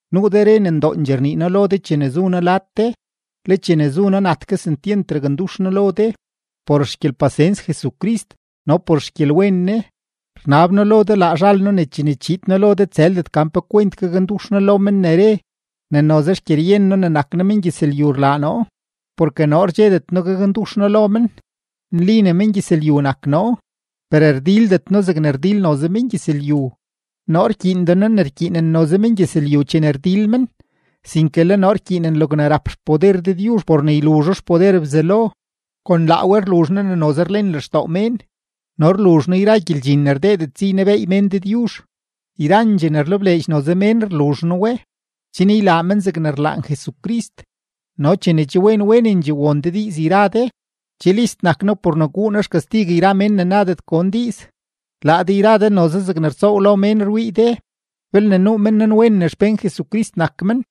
Nuu de re ne ndoondxee rnii noo chene zu noo lad de, le chene zu noo nat kesentyent rakndux noo lo de. Por xgyelpasens Jesucrist no por xgyelwen Ne, rnab noo lo de laa zhal noo ne chene chiid noo lo de tsëldet gan pe kwent gakndux noo lo men ne re ne noze xgyeryen noo ne nak noo mengyëzlyu rlaa noo. Porke noo rdxedet noo gakndux noo lo men. Nli ne mengyëzlyu nak noo, per rdildet noo zegne rdil noze mengyëzlyu. Noo rkyiinden noo ne rkyiinen noze mengyëzlyu chene rdil men, sinke le noo rkyiinen logne rap xpoder Dëdyuzh por ne yluzho xpoder Bzelo. Kon laa we rluzh noo ne noze rlen lextoo mén no rluzh noo yra gyeldxin ne rdeedet si ynebeey mén Dëdyuzh. Yrandxee ne rlebleedx noze mén rluzh noo we, chen ylaa men zegne rlaan Jesucrist. No chene che wen wenendxee won de diiz yra de, che list nak noo por ne guu noo xkastig yra mén ne nadet gon diiz. Laa de yra de noze zegne rtsoow lo mén rwii de. Belne nuu men nanwen ne xpén Jesucrist nak men,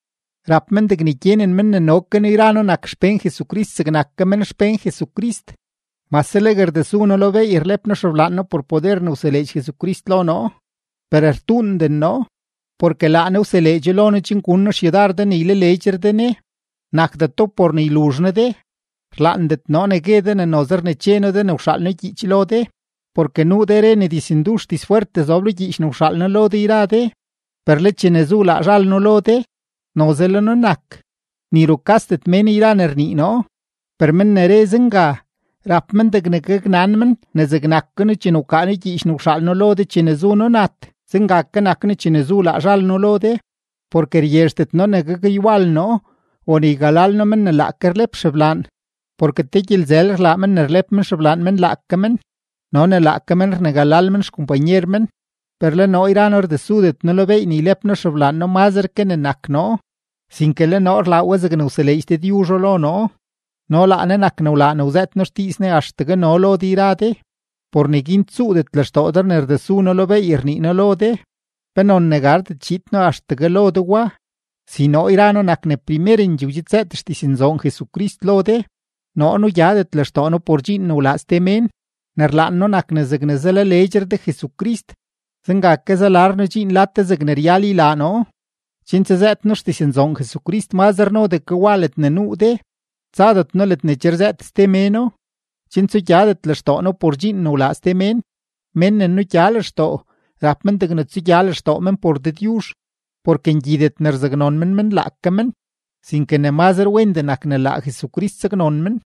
rap men degne gyenen men ne no ke noo yra noo nak xpén Jesucrist zegnak ke men xpén Jesucrist. Mase legue rdesu noo lo beey rlep noo xeblaan noo por poder ne wseleedx Jesucrist lo noo, per rtuunden noo; porke laa Ne wseleedxo lo noo chen gun noo xyudar de ne ylaleedxre de Ne, nakdeto por ne yluzh noo de. Rlaandet noo ne gue de ne noze rneche noo de ne wxaal noo gyiich lo de. Porke nuu de re ne dizndux dizfwerttee zob lo gyiich ne wxaal noo lo de yra de, per le chene zu noo laa zhal noo lo de, noze le noo nak, ni rukasdet mén yra ne rnii noo. Per men ne re zenga, rap men degne gaknan men ne zegnak ke noo chene wkaa noo gyiich ne wxaal noo lo de chene zu noo nat, zenga ke nak noo chene zu noo laa zhal noo lo de. Porke ryezhdet noo ne gakywal noo o ne ygalal noo men ne laake rlep xeblaan, porke te gyelzël rlaa men ne rlep men xeblaan men laake men no ne laake men rnegalal men xkompanyer men. Per le noo yra noo rdesudet noo lo beey ne ylep noo xeblaan noo mazre ke ne nak noo, sinke le noo rlaa we zegne wseleedx Dëdyuzho lo noo, no laa Ne nak ne wlaa ne wzëët noo xdiiz Ne axtegue no lo de yra de. Por neguin tsuudet lextoo de ne rdesu noo lo beey rnii noo lo de, penon ne gardet chiid noo axtegue lo de wa; si noo yra noo nak ne primerendxee wdxidzëët xdiznzoon Jesucrist lo de. Noo nugyadet lextoo noo por dxiin ne wlaa ste mén. Ne rlaan noo nak ne zegne zalaleedxre de Jesucrist, zenga ke zalar noo dxiin lad de zegne ryal ylaa noo, chen tsazëët noo xdiznzoon Jesucrist mazre nodee ke wa ledne nuu de; tsadet noo ledne che rzëët ste méno, chen tsugyadet lextoo noo por dxiin ne wlaa ste mén. Mén ne nugya lextoo, rap men degne tsugya lextoo men por Dëdyuzh. Porke ngyidet ne rzaknon men men laake men, sinke ne mazre wendee nak ne laa Jesucrist saknon men.